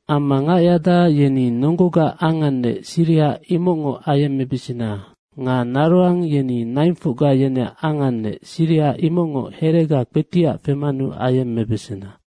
Amma ngac yada yeni nonggogaac angannec, siriha imocngoc ayemmebesena nga naroang yeni naingfocga yeneac angannec, siriha imocngoc herega kpetiac femanu ayemmebesena.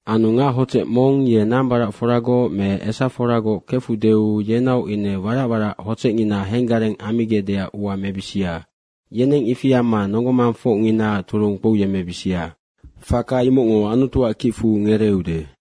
Anu ngac hodzec mong ye nambaracforagoc me esaforagoc kefudeu yenaoc ine warac warac hodzecngina henggareng ammigecdeac ua mebisia. Yeneng ifi amma nonggo mangfocnginaac turung kpouyemmebisia. Faka imocngo Anutuac kicfu ngereeude.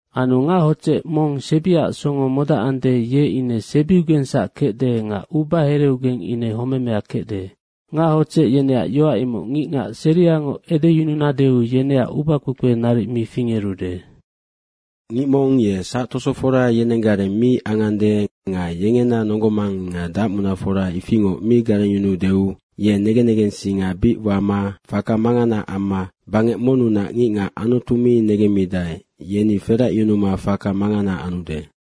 Anu ngac hodzec mong sebiac songo modacande, ye ine sebiugengsac kecde nga ubahereugeng ine homemea kecde. Ngac hodzec yeneac yoac imoc ngicngac seriangoc edeyununadeu yeneac ubakpekpe naric mi fingerude. Ngic mong ye sactosofora yenenggareng mi angande nga yengena nonggo mang nga dacmunafora ifingoc mi garengyunuudeu ye negen negensinga bic wama faka mangana amma bangec monnunac ngicngac Anutu mi negemmidae, yeni feracyunuma faka mangana anude.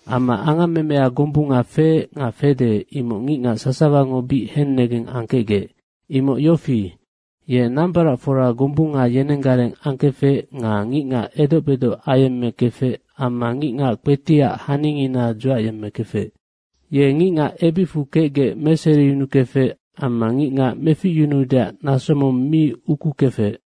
Amma angammemea gombunga feec nga fede, imoc ngicngac sasawango bic hennegeng angkecgec. Imoc yofi, ye nambaracfora gombunga yenenggareng angkefec nga ngicngac edoc bedoc ayemmekefec amma ngicngac kpetiac haningina dzuacyemmekefec. Ye ngicngac ebicfu kecgec meseriyunukefec amma ngicngac meficyunuudeac naso mong mi ukukefec.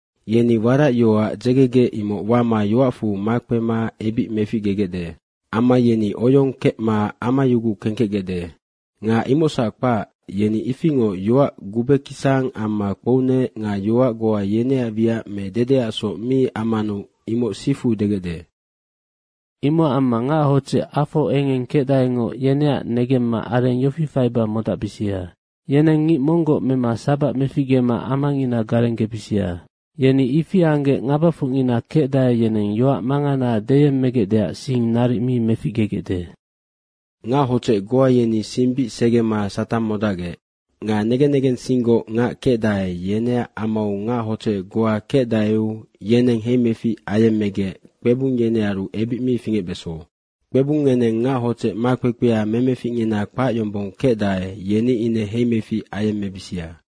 Yeni warac yoac dzegegec, imoc wama yoacfu makpema ebic meficgegecde. Amma yeni oyong kecma amayuguc kengkecgecde. Nga imocsac kpac, yeni ifingoc yoac gubekisang amma kpounec nga yoac goa yeneac wiac me dedeacsoc mi ammanu imoc sifu degecde. Imocac amma ngac hodzec afo engeng kecdaengoc yeneac negemma areng yofi faiba modacbisia. Yeneng ngic monggoc mema sabac meficgema amangina garenggebisia. Yeni ifi anggec ngabafocnina kecdae, yeneng yoac mangana deyemmegecdeac sing naric mi meficgegecde. Ngac hodzec goa yeni sing bic segema Satang modacgec. Nga negen negensinggoc ngac kecdae, yeneac amau ngac hodzec goa kecdaeu yeneng heimefic ayemmegec kpebung yenearu ebic mi fingecbeso. Kpebung ngeneng ngac hodzec makpekpea memeficngina kpac yombong kecdae, yeni ine heimefic ayemmebisia.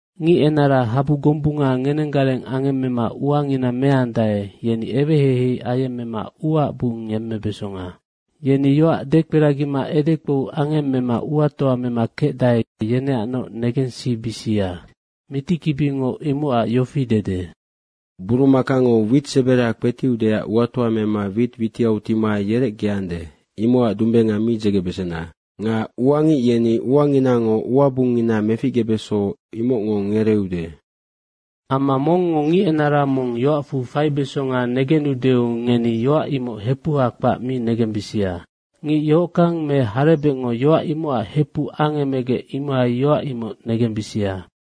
Ngic enara habu gombunga ngenenggareng angemmemma uangina meandae, yeni eweheihei ayemmema uaac bung yemmebesonga. Yeni yoac dekperagima edekpou angemmema uatoa mema kecdae, yeneacnoc negensibisia. Mitikibingo imocac yofi dede, “Burumakango wit sebera kpetiudeac uatoa mema wit witiau tima yerecgeande, imocac dumbenga mi dzegebesena.” nga “Uangic yeni uanginango uabungngina meficgebeso, imocngo ngereeude.” Amma mongngo ngic enara mong yoacfu faibesonga negenudeu, ngeni yoac imoc hepuha kpac mi negembisia. Ngic yohockang me harebecngo yoac imocac hepuc angemegec, imohai yoac imoc negembisia.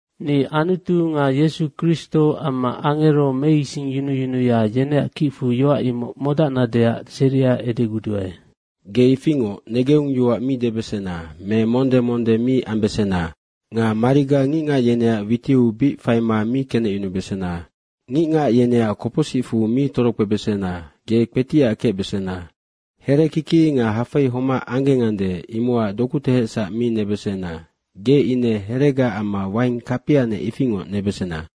Anu ni Anutu nga Yesu Kristo amma angero meisingyunuyunuya, yeneac kicfu yoac imoc modacnadeac seria edeguduae. Ge ifingoc negeung yoac mi debesena me monde monde mi ambesena. Nga mariga ngicngac yeneac witiu bic faima mi kenecyunubesena. Ngicngac yeneac kopocsicfu mi torokpebesena. Ge kpetiac kecbesena. Herekiki nga hafei homac anggengande, imocac doku tehecsac mi nebesena. Ge ine heregaac amma waing kapianec ifingoc nebesena.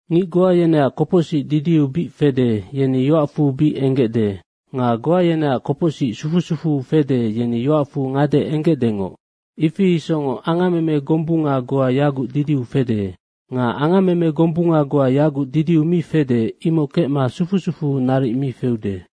Ngic goa yeneac kopocsic didiu bic fede, yeni yoacfu bic enggecde. Nga goa yeneac kopocsic sufu sufuu fede, yeni yoacfu ngade enggecdengoc. Ifi isocngoc angammeme gombunga goa yaguc didiu fede. Nga angammeme gombunga goa yaguc didiu mi fede, imoc kecma sufu sufuu naric mi feude.